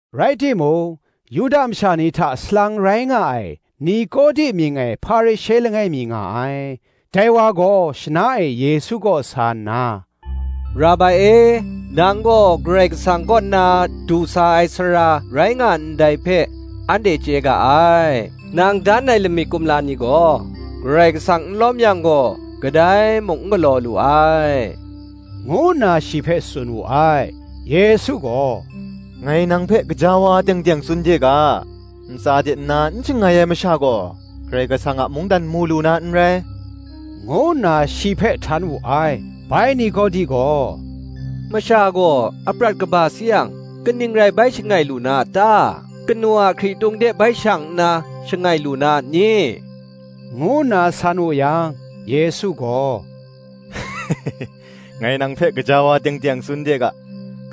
Rai timung, Yuda masha ni hta salang rai nga ai Nikodi mying ai Hparishe langai mi nga ai: dai wa gaw shana e Yesu kaw sa nna, “Rabai e, nang gaw Karai Kasang kaw nna du sa ai sara rai nga ndai hpe, anhte chye ga ai: nang dan ai lamik kumla ni gaw, Karai Kasang n lawm yang gaw, kadai mung n galaw lu ai,” ngu nna shi hpe tsun wu ai. Yesu gaw, “Ngai nang hpe gaja wa teng teng tsun de ga, Ntsa de nna n shangai ai masha gaw, Karai Kasang a mungdan mu lu na n rai,” ngu nna shi hpe htan wu ai. Bai Nikodi gaw, “Masha gaw aprat kaba sayang, kaning rai bai shangai lu na a ta? kanu a hkritung de bai shang nna shangai lu na a ni?” ngu nna san wu yang, Yesu gaw, “Ngai nang hpe gaja wa teng teng tsun de ga,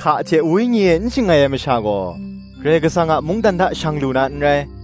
Hka hte Wenyi e n shangai ai masha gaw, Karai Kasang a mungdan hta shang lu na n rai;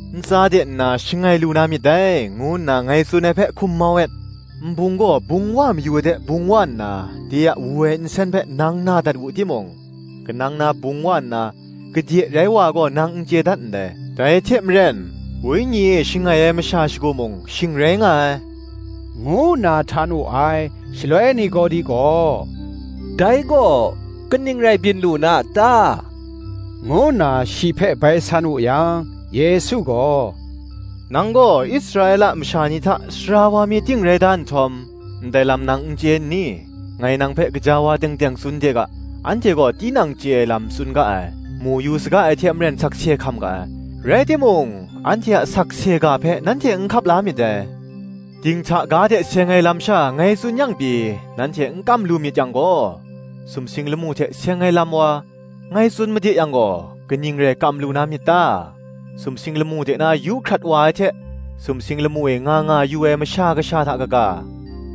‘Ntsa de nna shangai lu na myit dai,’ ngu nna ngai tsun ai hpe hkum mau et. Nbung gaw bung wa mayu ai de bung wa nna, de a wu ai nsen hpe nang na dat wu timung, kanang na bung wa nna, gade rai wa ai gaw, nang n chye dat ndai; dai hte maren, Wenyi e shangai ai masha shagu mung shing rai nga ai,” ngu nna htan wu ai. Shaloi Nikodi gaw, “Dai gaw kaning rai byin lu na a ta?” ngu nna shi hpe bai san wu yang, Yesu gaw “Nang gaw Israela masha ni hta sara wa mi ting rai da nhtawm, ndai lam nang n chye nni? Ngai nang hpe gaja wa teng teng tsun de ga, Anhte gaw tinang chye ai lam tsun ga ai, mu yu saga ai hte maren sakse hkam ga ai; rai timung anhte a sakse ga hpe, nanhte n hkap la myit dai. Dinghta ga hte seng ai lam sha ngai tsun yang pyi, nanhte n kam lu myit yang gaw, sumsing lamu hte seng ai lam wa, ngai tsun made yang gaw, kaning rai kam lu na myit ta? Sumsing lamu de na yu hkrat wa ai hte, sumsing lamu e nga nga yu ai Masha Kasha hta kaga,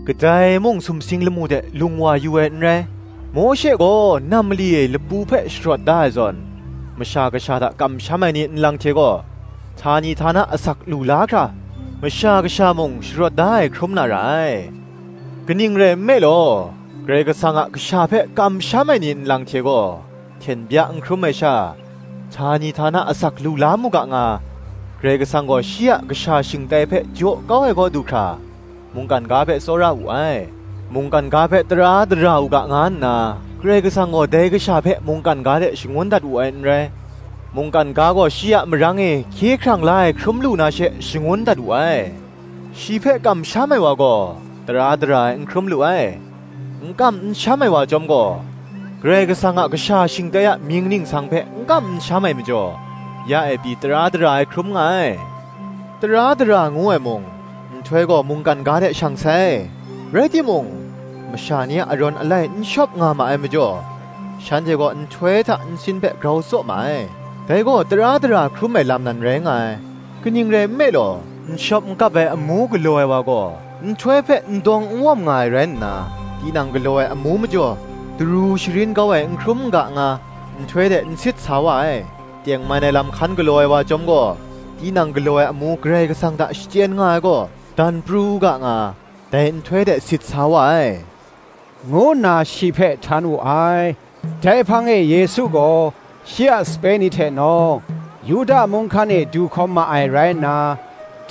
kadai mung sumsing lamu de lung wa yu ai n rai. Mawshe gaw nam mali e lapu hpe sharawt da ai zawn, Masha Kasha hta kamsham ai ni nlang hte gaw, htani htana asak lu la hkra, Masha Kasha mung sharawt da ai hkrum na ra ai. Kaning rai nme law, Karai Kasang a Kasha hpe kamsham ai ni nlang hte gaw, hten bya n hkrum ai sha, htani htana asak lu la mu ga nga, Karai Kasang gaw shi a Kasha shingtai hpe jaw kau ai kaw du hkra, mungkan ga hpe tsawra wu ai. Mungkan ga hpe tara dara u ga nga nna, Karai Kasang gaw dai Kasha hpe mungkan ga de shangun dat wu ai n rai; mungkan ga gaw shi a marang e hkye hkrang la ai hkrum lu na she, shangun dat wu ai. Shi hpe kamsham ai wa gaw tara dara ai n hkrum lu ai; n kam n sham ai wa chyawm gaw, Karai Kasang a Kasha shingtai a mying ningsang hpe n kam n sham ai majaw, ya e pyi tara dara ai hkrum nga ai. Tara dara ngu ai mung, Nhtoi gaw mungkan ga de shang sai, rai timung, masha ni a arawn alai n shawp nga ma ai majaw, shanhte gaw nhtoi hta nsin hpe grau tsaw ma ai, dai gaw tara dara hkrum ai lam nan rai nga ai. Kaning rai nme law, n shawp n kap ai amu galaw ai wa gaw, nhtoi hpe n dawng n wawm nga ai rai nna, tinang galaw ai amu majaw, daru sharin kau ai n hkrum n ga nga, nhtoi de n sit sa wa ai. Tengman ai lam hkan galaw ai wa chyawm gaw, tinang galaw ai amu Karai Kasang hta shachyen nga ai gaw, dan pru u ga nga, dai nhtoi de sit sa wa ai,” ngu nna shi hpe htan wu ai. Dai hpang e Yesu gaw shi a sape ni hte nawng, Yuda mung hkan e du hkawm ma ai rai nna,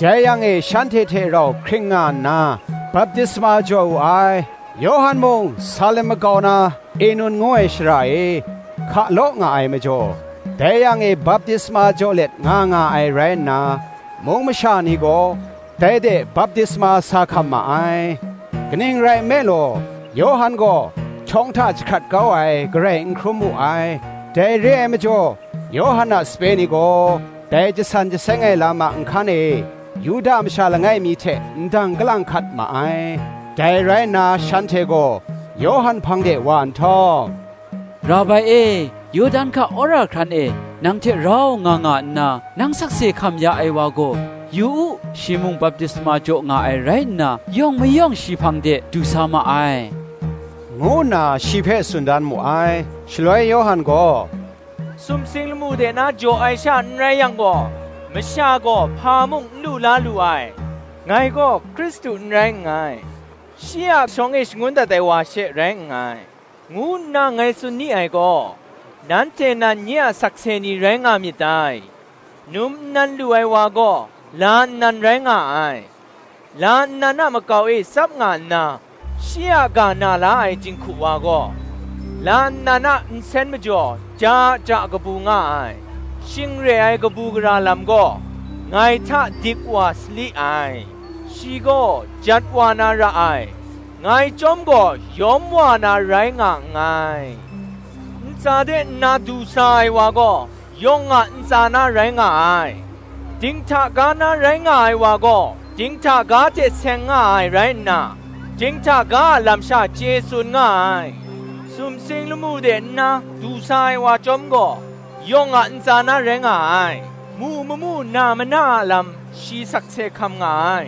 dai yang e shanhte hte rau hkring nga nna baptisma jaw wu ai. Yawhan mung, Salim makau na Enun ngu ai shara e, hka law nga ai majaw, dai yang e baptisma jaw let nga nga ai rai nna, mung masha ni gaw dai de baptisma sa hkam ma ai. Kaning rai nme law, Yawhan gaw htawng hta jahkrat kau ai, garai n hkrum wu ai. Dai re ai majaw, Yawhan a sape ni gaw, dai jasan jaseng ai lam a nhkan e, Yuda masha langai mi hte ndang kalang hkat ma ai. Dai rai nna shanhte gaw Yawhan hpang de wa nhtawm, “Rabai e, Yawdan hka wora hkran e nang hte rau nga nga nna, nang sakse hkam ya ai wa gaw, yu u, shi mung baptisma jaw nga ai rai nna, yawng mayawng shi hpang de du sa ma ai,” ngu nna shi hpe tsun dan mu ai. Shaloi Yawhan gaw, “Sumsing lamu de na jaw ai sha n rai yang gaw, masha gaw hpa mung n lu la lu ai. ‘Ngai gaw Hkristu n rai nngai, shi a shawng e shangun dat ai wa she rai nngai,’ ngu nna ngai tsun ni ai gaw, nanhte nan nye a sakse ni rai nga myit dai. Num nnan lu ai wa gaw, la nnan rai nga ai; la nnan a makau e tsap nga nna, shi a ga na la ai jinghku wa gaw, la nnan a nsen majaw ja ja kabu nga ai: shing re ai kabu gara lam gaw, ngai hta dik wa sali ai. Shi gaw jat wa na ra ai, ngai chyawm gaw yawm wa na rai nga nngai. Ntsa de nna du sa ai wa gaw, yawng a ntsa na rai nga ai: dinghta ga na rai nga ai wa gaw, dinghta ga hte seng nga ai rai nna, dinghta ga a lam sha chye tsun nga ai: sumsing lamu de nna du sa ai wa chyawm gaw, yawng a ntsa na rai nga ai. Mu mamu na mana a lam shi sakse hkam nga ai;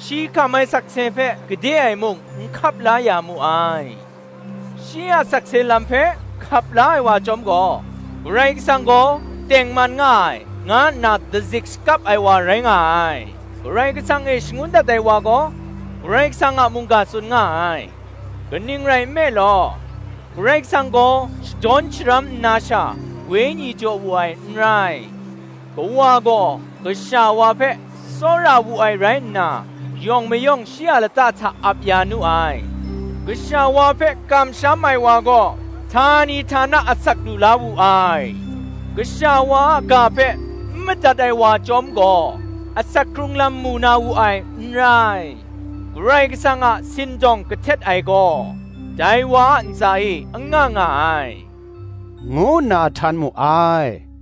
shi hkam ai sakse hpe gade e muk n hkap la ya mu ai. Shi a sakse lam hpe hkap la ai wa chyawm gaw, Karai Kasang gaw tengman nga ai, nga nna dazik shakap ai wa rai nga ai. Karai Kasang e shangun dat ai wa gaw, Karai Kasang a mungga tsun nga ai: kaning rai nme law, Karai Kasang gaw shadawn sharam nna sha, Wenyi jaw wu ai n rai. Kawa gaw Kasha wa hpe tsawra wu ai rai nna, yawng mayawng shi a lata hta ap ya nu ai. Kasha wa hpe kamsham ai wa gaw, htani htana asak lu la wu ai: Kasha wa a ga hpe n madat ai wa chyawm gaw, asak hkrung lam mu na wu ai n rai: Karai Kasang a sindawng kahtet ai gaw, dai wa a ntsa e anga nga ai,” ngu nna htan mu ai.